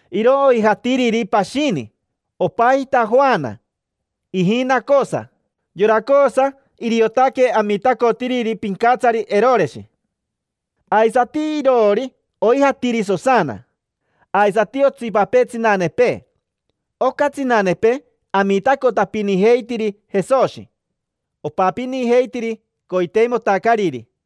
Iro oijatiriri pashini, opajita Joana, ijina Cosa. Yora Cosa, iriotaque amitacotiriri pincatsari Eroreshi. Aisati iroori oijatiri Sosana, aisati otsipapee tsinanepee. Oca tsinanepee amitacotapinijeitiri Jesoshi, opapinijeitiri coiteimotacariri.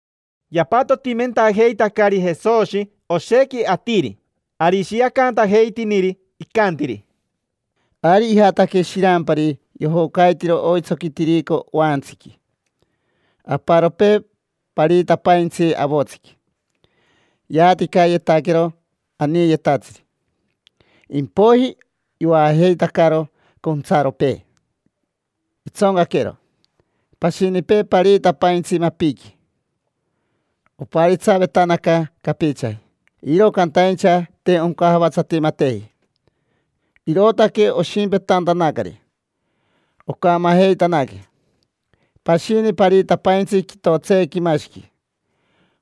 Yapatotimentajeitacari Jesoshi oshequi atiri, ari ishiacantajeitiniri, icantiri: —Ari ijataque shirampari yojocaitiro oitsoqui tirico oaantsiqui. Aparopee pariitapaintsi avotsiqui: yaaticayetaquero aniiyetatsiri, impoiji yoajeitacaro contsaropee, itsoncaquero. Pashinipee pariitapaintsi mapiqui. Oparitsavetanaca capichaji, iro cantaincha te oncajavatsatimateji, irootaque oshimpetantanacari, ocamajeitanaque. Pashini pariitapaintsi quitotseequimashiqui: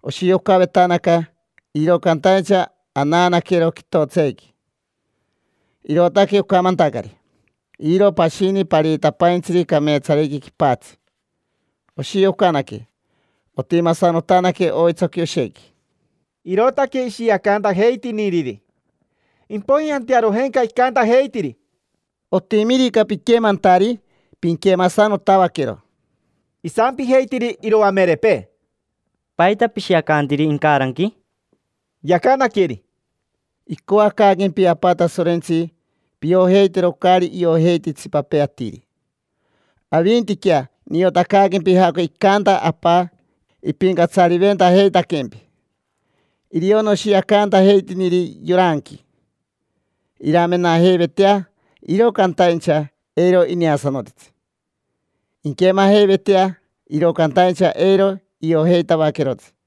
oshiocavetanaca, iro cantaincha anaanaquero quitotseequi, irootaque ocamantacari. Iro pashini pariitapaintsiri cameetsariqui quipatsi: oshiocanaque, otimasanotanaque oitsoqui oshequi. Irootaque ishiacantajeitiniriri, impoiji antearojenca icantajeitiri: —Otimirica piquemantari, pinquemasanotavaquero. Isampijeitiri iroamerepee: —¿Paita pishiacantiri incaranqui? Yacanaqueri: —Icoacaaquempi Apa Tasorentsi piojeitero caari iojeiti itsipapee atiri. Avintiquea niotacaaquempi jaoca icanta Apa ipincatsariventajeitaquempi. Irio noshiacantajeitiniri yoranqui: iramenajeivetea, iro cantaincha eiro ineasanotitsi; inquemajeivetea, iro cantaincha eiro iojeitavaquerotsi.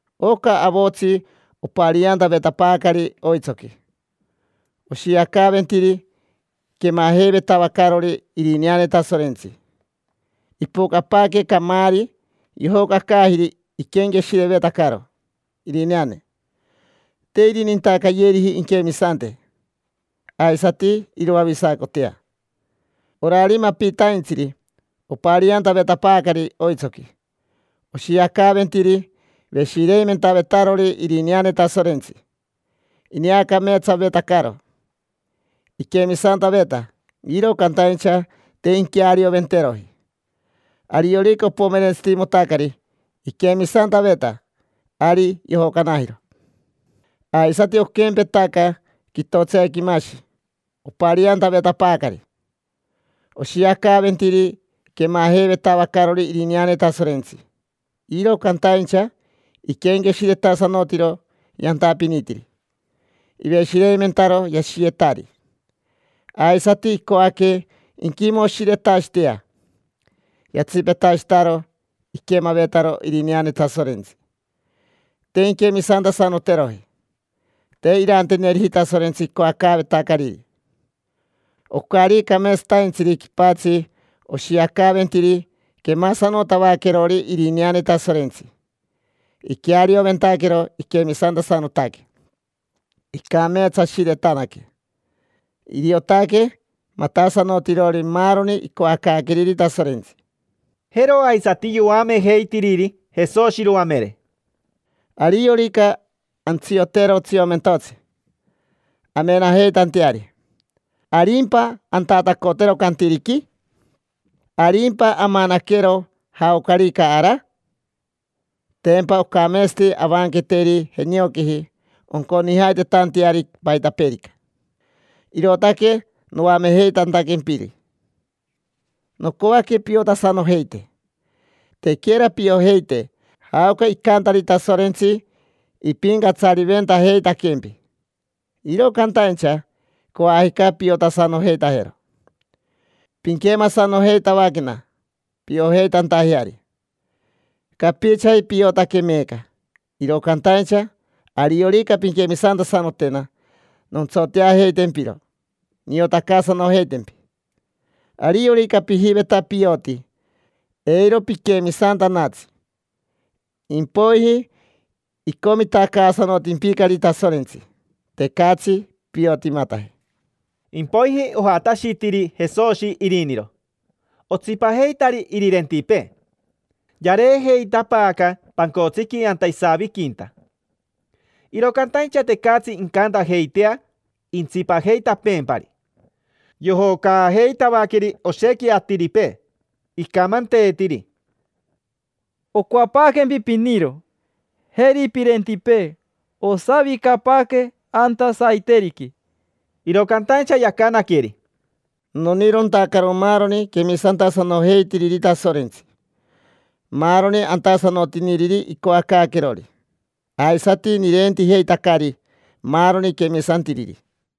Oca avotsi opariantavetapaacari oitsoqui oshiacaaventiri quemajeivetavacarori irineane Tasorentsi: ipocapaaque camaari, yojocacaajiri iquenqueshirevetacaro irineane. Te irinintacayeriji inquemisante aisati iroavisacotea. Orari mapitaintsiri opariantavetapaacari oitsoqui, oshiacaaventiri veshireimentavetarori irineane Tasorentsi, ineacameetsavetacaro. Iquemisantaveta, iro cantaincha te inquearioventeroji: ariorica opomerentsitimotacari iquemisantaveta, ari yojocanajiro. Aisati oquempetaca quitotseequimashi opariantavetapaacari: oshiacaaventiri quemajeivetacarori irineane Tasorentsi, iro cantaincha iquenqueshiretasanotiro yantapinitiri, iveshireimentaro yashiyetari, aisati icoaque inquimoshiretashitea. Yatsipetashitaro iquemavetaro irineane Tasorentsi: te inquemisantasanoteroji, te iranteneriji Tasorentsi icoacaavetacariri. Ocari cameetsataintsiri quipatsi oshiacaaventiri quemasanotavaquerori irineane Tasorentsi. Iquearioventaquero iquemisantasanotaque, icameetsashiretanaque. Iriotaque matasanotirori maaroni icoacaaqueriri Tasorentsi. Jero aisati yoamejeitiriri Jesoshi iroamere: —Ariorica antsiotero tsiomentotsi amenajeitanteari, ¿arimpa antatacotero cantiriqui? ¿Arimpa amanaquero jaocarica ara? Tempa ocameetsati avanqueteri jenioquiji onconijajeitanteari paitapeerica. Irootaque noamejeitantaquempiri: nocoaque piotasanojeite. Tequera piojeite jaoca icantari Tasorentsi ipincatsariventajeitaquempi, iro cantaincha coajica piotasanojeitajero. Pinquemasanojeitavaquena piojeitantajeari. Capichaji piotaque meeca, iro cantaincha ariorica pinquemisantasanotena, nontsoteajeitempiro, niotacaasanojeitempi. Ariorica pijiveta pioti, eiro piquemisantanatsi, impoiji icomitacaasanotimpicari Tasorentsi: tecatsi piotimataje. Impoiji ojatashitiri Jesoshi iriniro, otsipajeitari irirentipee. Yareejeitapaaca pancotsiqui anta isaviquinta, iro cantaincha tecatsi incantajeitea intsipajeitapeempari: yojocaajeitavaqueri oshequi atiripee. Icamanteetiri: —Ocoapaaquempi piniro, jeri pirentipee. Osavicapaaque anta saiteriqui. Iro cantaincha yacanaqueri: —Nonirontacaro maaroni quemisantasanojeitiriri Tasorentsi, maaroni antasanotiniriri icoacaaquerori. Aisati nirentijeitacari maaroni quemisantiriri.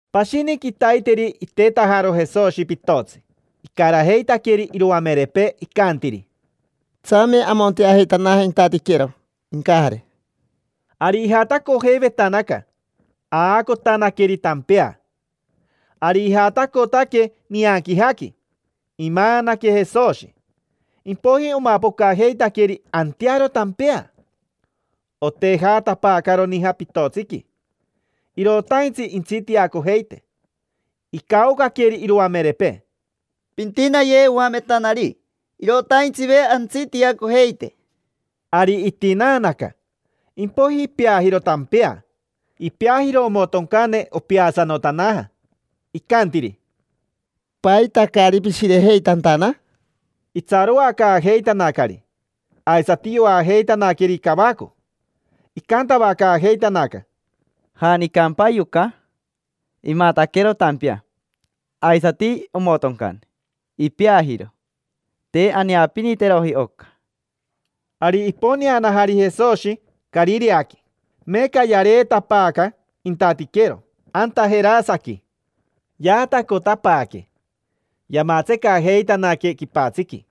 Pashini quitaiteri itetajaro Jesoshi pitotsi, icarajeitaqueri iroamerepee. Icantiri: —Tsame amonteajeitanaje intatiquero incajare. Ari ijatacojeivetanaca, aacotanaqueri tampea. Ari ijatacotaque nianquijaqui, imaanaque Jesoshi. Impoiji omapocajeitaqueri antearo tampea, otejatapaacaro nija pitotsiqui, irotaintsi intsitiacojeite. Icaocaqueri iroamerepee: —Pintinaye, oametanari, irotaintsive antsitiacojeite. Ari itinaanaca, impoiji ipeajiro tampea, ipeajiro omotoncane: opeasanotanaja. Icantiri: —¿Paita caari pishirejeitantana? Itsaroacaajeitanacari, aisati yoajeitanaqueri cavaco. Icantavacaajeitanaca: —¿Janicampa yoca? Imataquero tampea, aisati omotoncane: ipeajiro. Te aneapiniteroji oca. Ari iponeanajari Jesoshi Carireaqui, meeca yareetapaaca intatiquero: anta Jerasequi. Yaatacotapaaque, yamatsecajeitanaque quipatsiqui.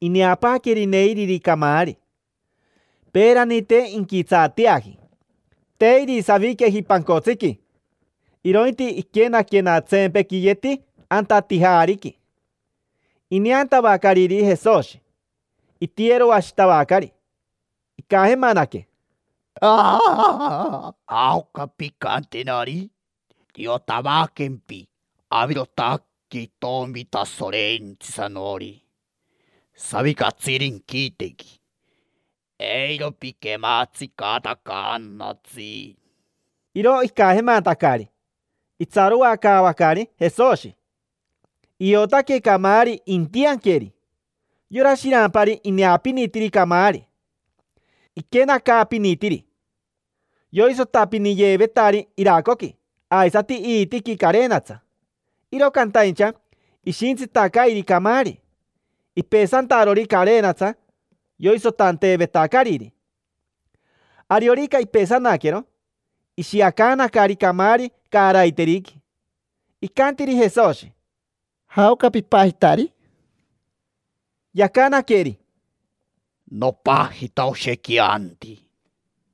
Ineapaaqueri neiriri camaari: peerani, te inquitsaateaji. Te irisaviqueji pancotsiqui, irointi iquenaquenatsempequiyeti anta tijaariqui. Ineantavacariri Jesoshi, itiyeroashitavacari, icajemanaque: —¿Jaoca pincantenari? Niotavaquempi: avirotaque itomi Tasorentsisanori savicatsiri inquitequi. Eiro piquematsitacaanatsi. Iro icajemantacari, itsaroacaavacari Jesoshi, iotaque camaari intianqueri. Yora shirampari ineapinitiri camaari, iquenacaapinitiri. Yoisotapiniyeevetari iracoqui aisati iitiqui carenatsa, iro cantaincha ishintsitacairi camaari, ipesantarori carenatsa yoisotanteevetacariri. Ariorica ipesanaquero, ishiacaanacari camaari caaraiteriqui. Icantiri Jesoshi: —¿Jaoca pipajitari? Yacanaqueri: —Nopajita Oshequianti.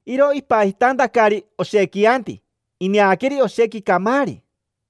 Iro ipajitantacari Oshequianti ineaqueri oshequi camaari.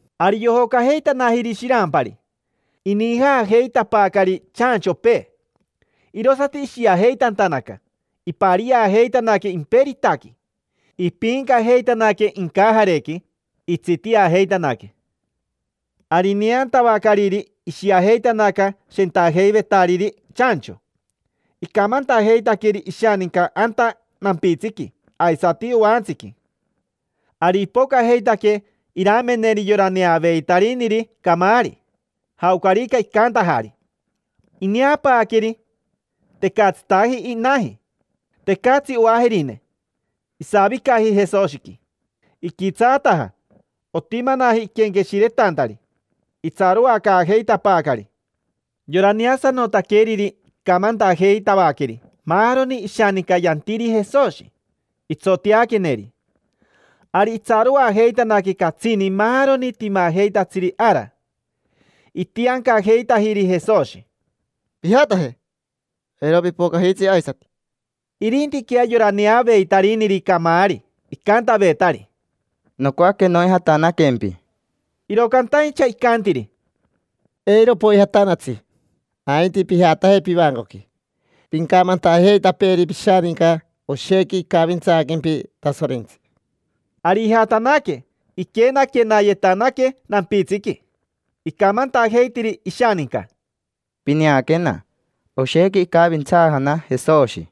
Ari yojocajeitanajiri shirampari, inijaajeitapaacari chanchopee, irosati ishiajeitantanaca, ipariajeitanaque imperitaqui, ipiincajeitanaque incajarequi, pocn, pocn, pocn, itsitiajeitanaque. Ari ineantavacariri, ishiajeitanaca shentajeivetariri chancho, icamantajeitaqueri ishaninca anta nampitsiqui aisati oantsiqui. Ari ipocajeitaque irameneri yora neaveitariniri camaari, jaocarica icantajari. Ineapaaqueri, tecatsitaji inaji; tecatsi oajerine, isavicaji Jesoshiqui. Iquitsaataja, otimanaji iquenqueshiretantari. Itsaroacaajeitapaacari. Yora neasanotaqueriri icamantajeitavaqueri maaroni ishaninca yantiri Jesoshi, itsoteaqueneri. Ari itsaroajeitanaque catsini maaroni timajeitatsiri ara. Itiancajeitajiri Jesoshi: —Pijataje, eiro pipocajitsi aisati. Irintiquea yora neaveitariniri camaari icantavetari: —Nocoaque noijatanaquempi. Iro cantaincha icantiri: —Eiro poijatanatsi, ainti pijataje pivacoqui. Pincamantajeitapeeri pishaninca oshequi icavintsaaquempi Tasorentsi. Ari ijatanaque, iquenaquenayetanaque nampitsiqui, icamantajeitiri ishaninca: —Pineaquena: oshequi icavintsaajana Jesoshi.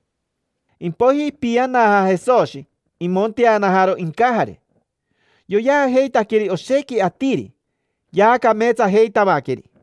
Impoiji ipianaja Jesoshi, imonteanajaro incajare. Yoyeajeitaqueri oshequi atiri, yaacameetsajeitavaqueri.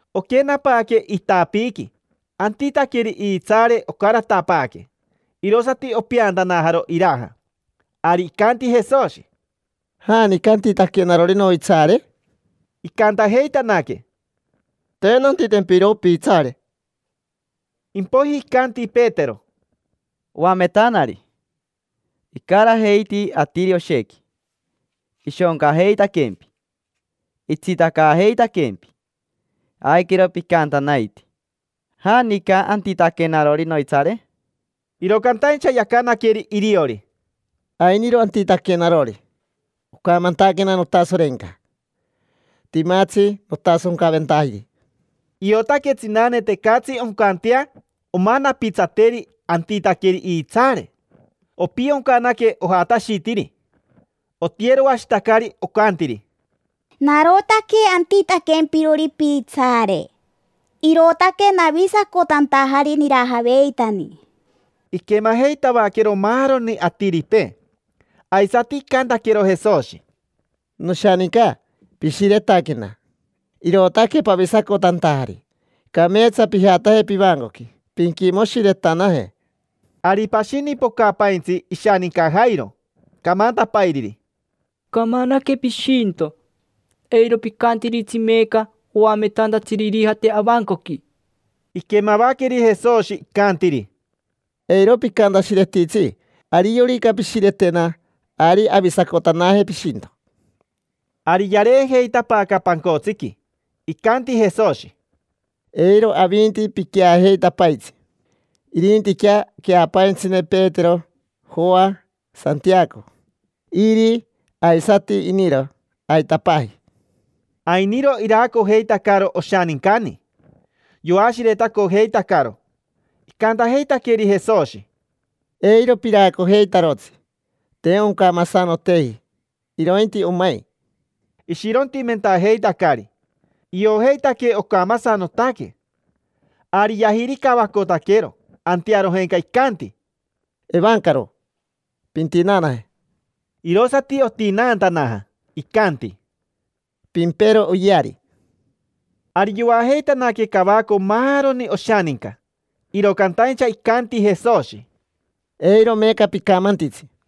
Oquenapaaque itapiiqui antitaqueri iitsaare ocaratapaaque, irosati opeantanajaro iraja. Ari icanti Jesoshi: —¿Janica antitaquenarori noitsaare? Icantajeitanaque: —Te nantitempiro piitsaare. Impoiji icanti Petero: —Oametanari, icarajeiti atiri oshequi ishoncajeitaquempi, itsitacajeitaquempi. Aiquero picantanaitii: “¿Janica antitaquenarori noitsaare?” Iro cantaincha yacanaqueri iriori: —Ainiro antitaquenarori. Ocamantaquena notasorenca: timatsi notasoncacoventajiri. Iotaque tsinane tecatsi oncantea omanapitsateri antitaqueri iitsaare. Opioncanaque, ojatashitiri, otiyeroashitacari, ocantiri: —Narotaque antitaquempirori piitsaare, irootaque navisacotantajari nirajaveitani. Iquemajeitavaquero maaroni atiripee. Aisati icantaquero Jesoshi: —Noshaninca, pishiretaquena, irootaque pavisacotantajari. Cameetsa pijataje pivancoqui, pinquimoshiretanaje. Ari pashini pocapaintsi ishaninca Jairo camantapairiri: —Camanaque pishinto. Eiro picantiritsi meeca oametantatsiri irijate avancoqui. Iquemavaqueri Jesoshi, icantiri: —Eiro picantashiretitsi. Ariorica pishiretena, ari avisacotanaje pishinto. Ari yareejeitapaaca pancotsiqui. Icanti Jesoshi: —Eiro avinti piqueajeitapaitsi: irintiquea queapaintsine Petero, Joa, Santiaco, iri, aisati iniro, aitapaaji. Ainiro iraacojeitacaro oshanincani, yoashiretacojeitacaro. Icantajeitaqueri Jesoshi: —Eiro piraacojeitarotsi: te oncamasanoteji, irointi omai. Ishirontimentajeitacari, iojeitaque ocamasanotaque. Ari yajiricavacotaquero, antearojenca icanti: —Evancaro, pintinaanaje. Irosati otinaantanaja. Icanti: —Pimpero oyeari. Ari yoajeitanaque cavaco maaroni oshaninca, iro cantaincha icanti Jesoshi: —Eiro meeca picamantitsi.